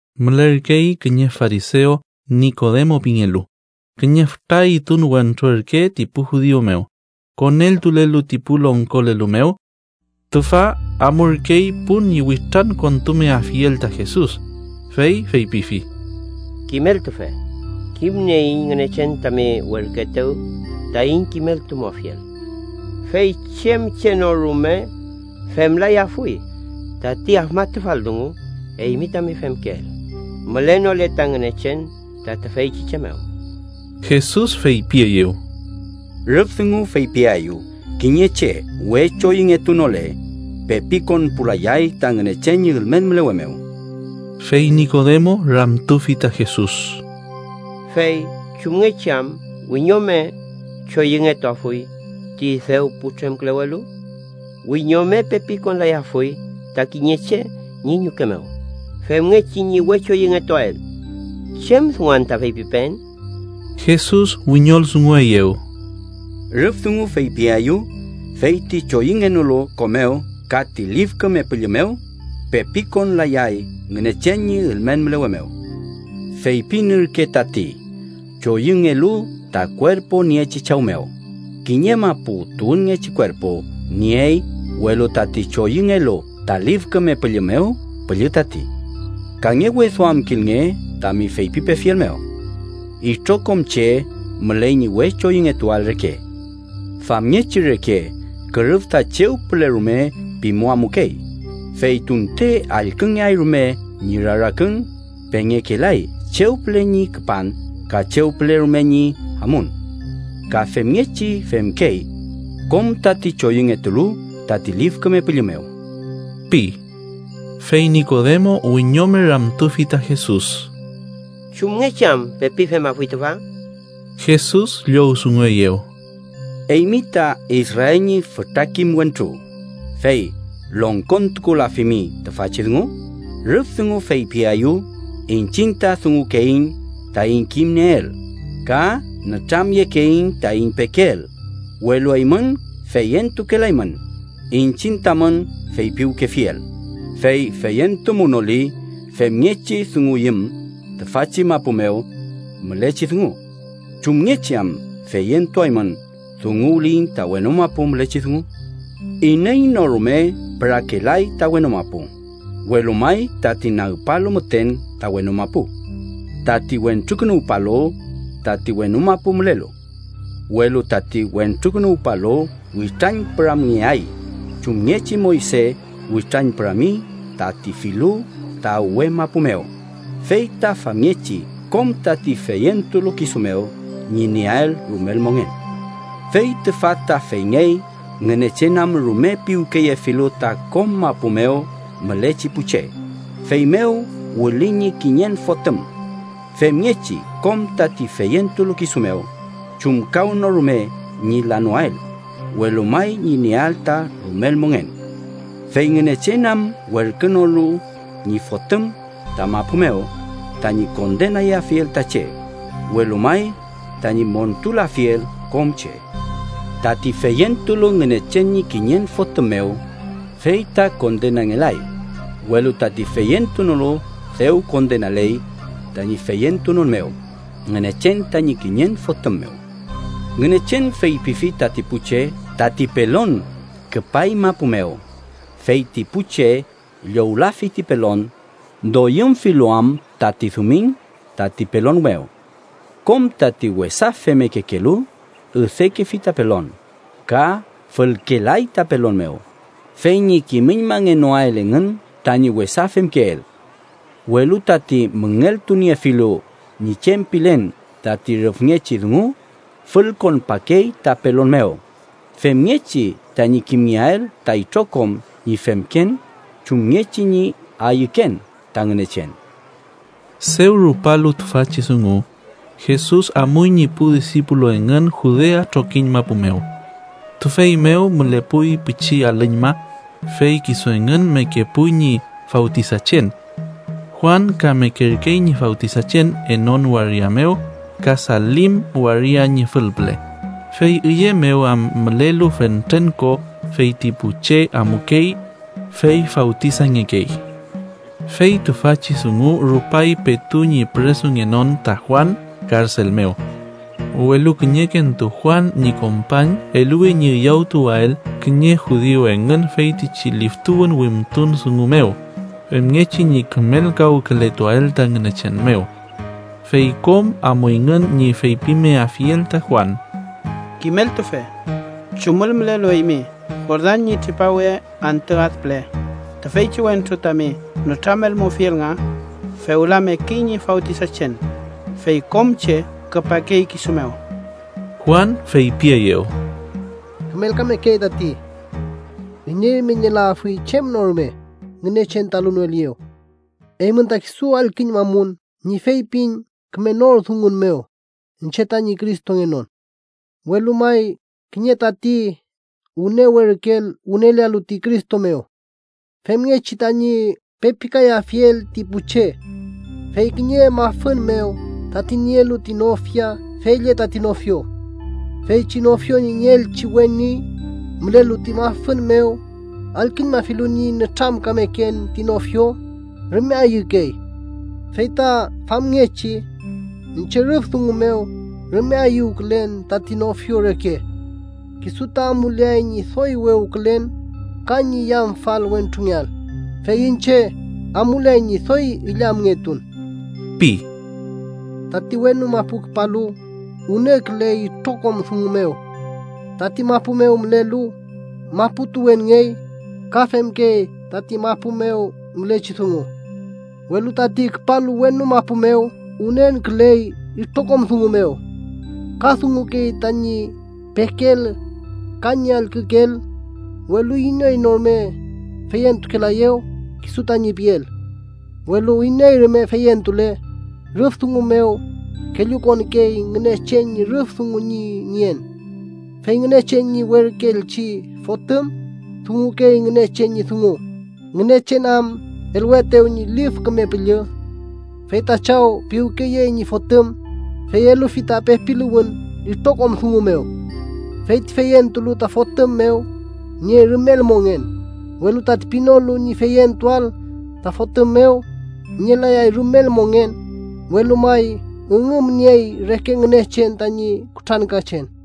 Mülerkey kiñe farisew Nikodemo pingelu, kiñe füta üytun wentru ürke ti pu judiu mew, koneltulelu ti pu longkolelu mew. Tüfa amurkey pun ñi witrankontumeafiel ta Jesus, fey feypifi: —Kimeltufe, kimnieiñ Ngünechen tami werküetew taiñ kimeltumuafiel, fey chem che no rume femlayafuy tati afmatufal dungu eymi tami femkeel, mülenole ta Ngünechen ta tüfeychi che mew. Jesus feypieyew: —Rüf dungu feypiaeyu kiñe che we choyüngetunole, pepi konpulayay ta Ngünechen ñi ülmen mülewe mew. Fey Nikodemo ramtufi ta Jesus: —¿Fey chumngechi am wiñome choyüngetuafuy ti dew putremkülewelu? Wiñome pepi konlayafuy ta kiñe che ñi ñuke mew, femngechi ñi we choyüngetuael. ¿Chem dungu anta feypipeen? Jesus wiñoldungueyew: —Rüf dungu feypiaeyu fey ti choyüngenolu ko mew ka ti Lif Küme Püllü mew, pepi konlayay Ngünechen ñi ülmen mülewe mew. Feypin ürke tati choyüngelu ta kuerpu niechi chaw mew, kiñe mapu tuwünngechi kuerpu niey, welu tati choyüngelu ta Lif Küme Püllü mew, püllü tati. Kangeweduamkilnge tami feypipefiel mew: ‘Itrokom che müley ñi we choyüngetuael reke’. Famngechi reke kürüf ta chew püle rume pimu amukey, fey tunte allküngeay rume ñi rarakün, pengekelay chew püle ñi küpan ka chew püle rume ñi amun. Ka femngechi femkey kom tati choyüngetulu tati Lif Küme Püllü mew ―pi. Fey Nikodemo wiñome ramtufi ta Jesus: —¿Chumngechi am pepi femafuy tüfa? Jesus llowdungueyew: —¿Eymi ta Israel ñi fütra kim wentru, fey longkontukulafimi tüfachi dungu? Rüf dungu feypiaeyu iñchiñ ta dungukeiñ taiñ kimnieel, ka nütramyekeiñ taiñ pekeel, welu eymün feyentukelaymün iñchiñ tamün feypiwkefiel, fey feyentumunoli femngechi dunguyüm tüfachi mapu mew mülechi dungu, ¿chumngechi am feyentuaymün dunguwliyiñ ta wenu mapu mülechi dungu? “Iney no rume pürakelay ta wenu mapu, welu may tati nagpalu müten ta wenu mapu: tati Wentrukünuwpalu, tati wenu mapu mülelu. Welu tati Wentrukünuwpalu witrañpüramngeay chumngechi Moyse witrañpürami tati filu ta uwe mapu mew, fey ta famngechi kom tati feyentulu kisu mew ñi nieael rumel mongen. “Fey tüfa ta feyngey Ngünechen am rume piwkeyefilu ta kom mapu mew mülechi pu che, feymew wüli ñi kiñen Fotüm femngechi kom tati feyentulu kisu mew chumkawnorume ñi lanoael, welu may ñi nieael ta rumel mongen. Fey Ngünechen am werkünolu ñi Fotüm ta mapu mew, tañi kondenayafiel ta che, welu may tañi montulafiel kom che. Tati feyentulu Ngünechen ñi kiñen Fotüm mew fey ta kondenangelay, welu tati feyentunolu dew kondenaley, tañi feyentunon mew Ngünechen tañi kiñen Fotüm mew. Ngünechen feypifi tati pu che: tati pelon küpay mapu mew, fey ti pu che llowlafi ti pelon, doyümfilu am tati dumiñ tati pelon mew. Kom tati wesa femmekekelu üdekefi ta pelon, ka fülkelay ta pelon mew, fey ñi kimüñmangenoael engün tañi wesa femkeel. Welu tati müngeltuniefilu ñi chem pilen tati rüfngechi dungu, fülkonpakey ta pelon mew femngechi tañi kimngeael ta itrokom ñi femken chumngechi ñi ayüken ta Ngünechen.” Dew rupalu tüfachi dungu, Jesus amuy ñi pu disipulu engün Judea trokiñ mapu mew. Tüfey mew mülepuy pichi alüñma, fey kisu engün mekepuy ñi fawtisachen. Juan ka mekerkey ñi fawtisachen Enon waria mew ka Salim waria ñi fülpüle, fey üye mew am mülelu fentren ko, fey ti pu che amukey, fey fawtisangekey. Fey tüfachi dungu rupay petu ñi püresungenon ta Juan karsel mew. Welu kiñekentu Juan ñi kompañ eluwi ñi üyawtuwael kiñe judiu engün feytichi liftuwün wimtun dungu mew, femngechi ñi kümelkawkületuael ta Ngünechen mew. Fey kom amuyngün ñi feypimeafiel ta Juan: —Kimeltufe, chumül mülelu eymi Jordan ñi tripawe antü ad püle, tüfeychi wentru tami nütramelmufiel nga, fewla mekey ñi fawtisachen, fey kom che küpakey kisu mew. Juan feypieyew: —Kümelkamekey tati. Iney rume nielayafuy chem no rume, Ngünechen ta elunoeliyew. Eymün ta kisu allküñmamun ñi feypin küme nor dungun mew iñche tañi Cristongenon, welu may kiñe tati wüne werküel wünelealu ti Cristo mew, femngechi tañi pepikayafiel ti pu che. Fey kiñe mafün mew, tati nielu ti nofia fey lle tati nofio. Feychi nofio ñi nieelchi weni, mülelu ti mafün mew allküñmafilu ñi nütramkameken ti nofio, rume ayükey. Fey ta famngechi iñche rüf dungu mew rume ayüwkülen tati nofio reke. Kisu ta amuleay ñi doy wewkülen ka ñi yamfal wentrungeael, fey iñche amuleay ñi doy illamngetun ―pi. “Tati wenu mapu küpalu wünenküley itrokom dungu mew. Tati mapu mew mülelu mapu tuwünngey, ka femkey tati mapu mew mülechi dungu. Welu tati küpalu wenu mapu mew wünenküley itrokom dungu mew. Ka dungukey tañi pekeel ka ñi allkükeel, welu iney no rume feyentukelaeyew kisu tañi piel. Welu iney rume feyentule, rüf dungu mew kellukonkey Ngünechen ñi rüf dungu ñi nien. Fey Ngünechen ñi werküelchi Fotüm dungukey Ngünechen ñi dungu, Ngünechen am eluetew ñi Lif Küme Püllü. Fey ta Chaw piwkeyey ñi Fotüm, fey elufi ta pepiluwün itrokom dungu mew. Fey ti feyentulu ta Fotüm mew niey rumel mongen, welu tati pinolu ñi feyentuael ta Fotüm mew, nielayay rumel mongen, welu may üngümniey reke Ngünechen tañi kutrankachen.”